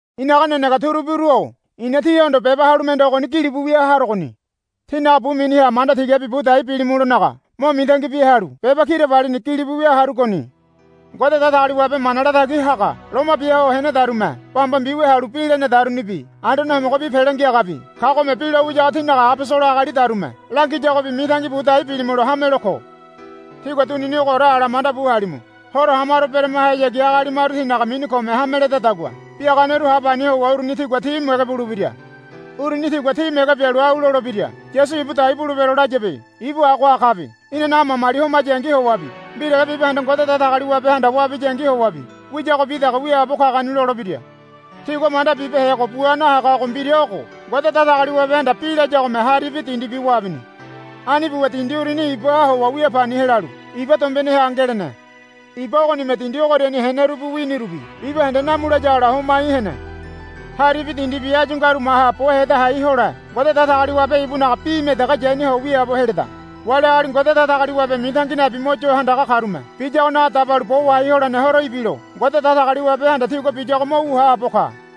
I̱naga nenege turubiru-o i̱na tíhondo beba halu mende ogoni gilibu wia harogoni. Tínaga bu miniha manda tigabi bu dai bilimulonaga mo mitangi bia halu beba kirabalini gilibu wia harugoni. Ngode Datagaliwabe mana latagi haga loma bia ho henedarume bamba mbiwia halu bi lenedarubi Anduane Homogobi Pele Ngiagabi kagome bi lo wiyago tínaga abosolo agalidarume langiyagobi mitangi bu dai bilimulo hamelo ko. Tígua dunini ogoore ala mandabu halimu. Horo hamaro beremahayagi agali maru tinaga mini kome hame ledadagua biaganeru ha pani howa uruni tigua tí mege bulebira. Uruni tigua tí mege bialu au lolebira. Yasu ibu dai bulebero layabe. Ibu agoha kabe. Inanaga mamali homayangi howabi mbirale bibahende Ngode Datagaliwabehanda wabiyangi howabi wiyagobi dege wiaabo kagoni, lolebira. Tigua manda bibehego bua nahagago mbira ogo. Ngode Datagaliwabehanda bi layagome haribi dindibi wabini. Ani buwa dindi uruni ibaha howa wia pani helalu iba dombeneha ngelene. Iba ogonime dindi ogoriani henerubi winirubi bibahende namu layagola homai hene. Haribi dindibi áyu ngaru maha bo heda hai hole Ngode Datagaliwabe ibunaga bime dege yaniho wiaabo heleda. Wali agali Ngode Datagaliwabe mitangi nabi mo yo handaga karume biyagonaga dabalu bo wahai holene horo ibilo Ngode Datagaliwabehanda tigua biyago mo wu haabo ka.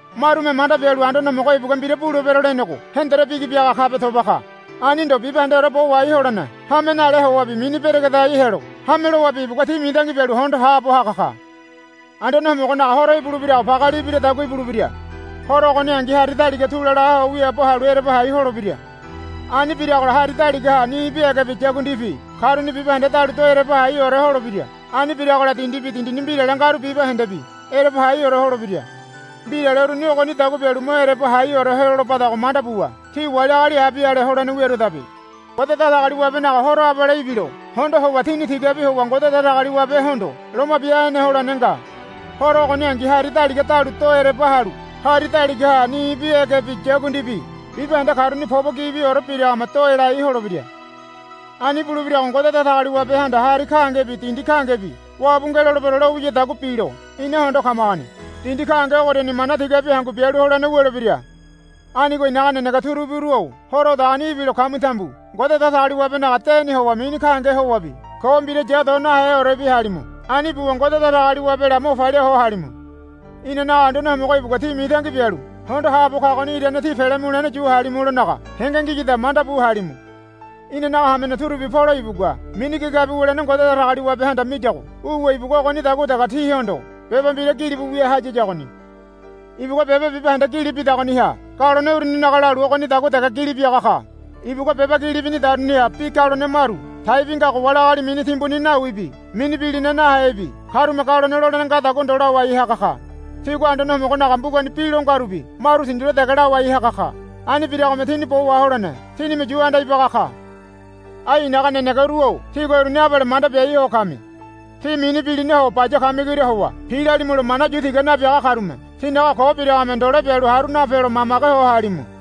Marume manda bialu Anduane Homogo ibugua mbira bulebero lenego hendore bigi biaga kabe toba ka. Ani ndo bibahendeore bo wahai holene hame nale howabi mini beregedai helo hame lowabi ibugua tí mitangi bialu hondo haabo haga ka. Anduane Homogonaga Horo ibulebirago pageali ibiradagua ibulebira. Horo ogoningi hari daliga tula laho wiaabo halu ereba hai holebira. Ani biragola hari daligaha nibi egebi yakundibi karuni bibahende dalu do ereba haiore holebira. Ani biragola dindibi dindini mbirale ngaru bibahendebi ereba haiore holebira. Mbirale uruni ogonidagua bialu mo ereba haiore helolebadago manda buwa tí wali agali abi ale holene wiaruadabe. Ngode Datagaliwabenaga Horo abale ibilo hondo howa tíni tigabi howa Ngode Datagaliwabehondo loma bia hene holene nga. Horo ogoningi hari daliga dalu do ereba halu hari daligaha nibi egebi yakundibi bibahende karuni pobo gibiore biragome do elai holebira. Ani bulebirago Ngode Datagaliwabehanda hari gahengebi dindi gahengebi wabu ngelolebero lo wiyadagua bilo ina hondo kamagoni. Dindi gahenge ogoriani mana tigabi hangu bialu holene wulebira. Anigo i̱naga nenege turubiru-o Horo odagoni ibilo kami tambu Ngode Datagaliwabenaga deni howa mini gahenge howabi ko mbira ya do naheorebi halimu. Ani buwa Ngode Datagaliwabela mo palia ho halimu. Inanaga Anduane Homogo ibugua tí mitangi bialu hondo haabo kagoni irane tí pele mulene yu halimulonaga henge ngiyada manda bu halimu. Inanaga hamene turubi Polo ibugua mini gigabi wulene Ngode Datagaliwabehanda miyago wuwa ibugua ogonidagua dege tíhondo beba mbira gilibu wia hayiyagoni. Ibugua beba bibahende gili bidagoniha galone uruninaga lalu ogonidagua dege gili biaga ka. Ibugua beba gili binidaruniha bi galone maru taibi ngago wali agali mini timbuni nawibi mini bilina nahebi karume galone lolene ngadagua ndo lawai haga ka. Tigua Anduane Homogonaga mbugani bi lo ngarubi maru tindule dege lawai haga ka. Ani biragome tini bo waholene tinime yu anda ibaga ka. Ai i̱naga nenegeru-o tígua uruni abale manda biai ho kami. Tí mini bilinaho baya kamigoria howa pilalimulo mana yu tiga nabiaga karume tinaga ko biragome ndole bialu haru napelo mamage ho halimu.